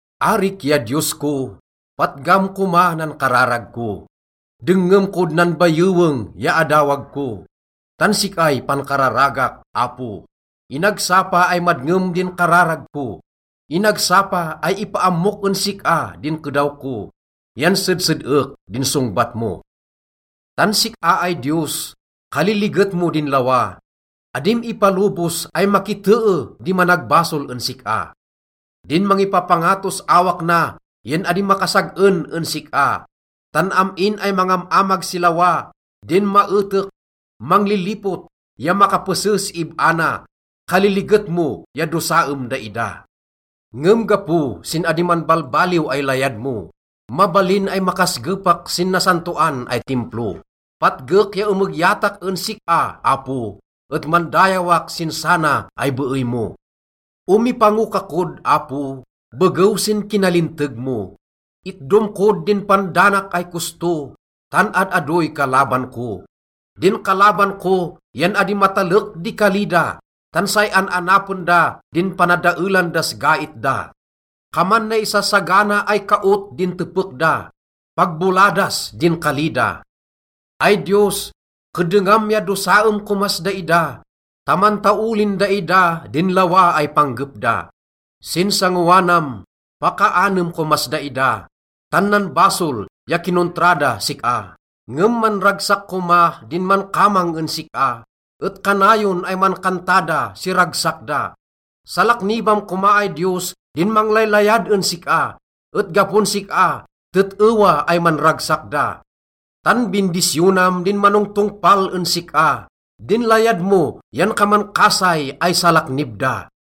Arik ya Diyos ko, patgam koma nan kararag ko, dengngem kod nan bayeweng ya adawag ko, tan sik-ay pankararagak, Apo. Inagsapa ay madngem din kararag ko, inagsapa ay ipaammok en sik-a din kedaw ko, yan sedsed-ek din songbat mo. Tan sik-a ay Diyos, kaliliget mo din lawa, adim ipalobos ay makitee di managbasol en sik-a. Din mangipapangatos awak na yan adi makasag-en en sik-a, tan am-in ay mangam-amag si lawa— din maetek, manglilipot, ya makapese si ib-a na— kaliliget mo ya dosaem daida. Ngem gapo sin adi manbalbaliw ay layad mo, mabalin ay makasgepak sin nasantoan ay Timplo. Patgek ya emegyatak en sik-a, Apo, et mandayawak sin sana ay beey mo. Omipango ka kod, Apo, begew sin kinalinteg mo, itdom kod din pandanak ay kosto, tan ad-adoy kalaban ko. Din kalaban ko yan adi matalek di kali da, tan say an-anapen da din panadaelan das gait da. Kaman naisasagana ay kaot din tepek da. Pag boladas din kali da. Ay Diyos, keddengam ya dosaem komas daida ta mantaolin daida din lawa ay panggep da. Sin sangoanam, pakaanem komas daida, tan nanbasol ya kinontra das sik-a. Ngem manragsak koma din mankamang en sik-a, et kanayon ay mankanta da si ragsak da. Salaknibam koma ay Diyos din manglaylayad en sik-a, et gapon sik-a, tet-ewa ay manragsak da. Tan bindisyonam din manongtongpal en sik-a. Din layad mo yan kaman kasay ay salaknib da.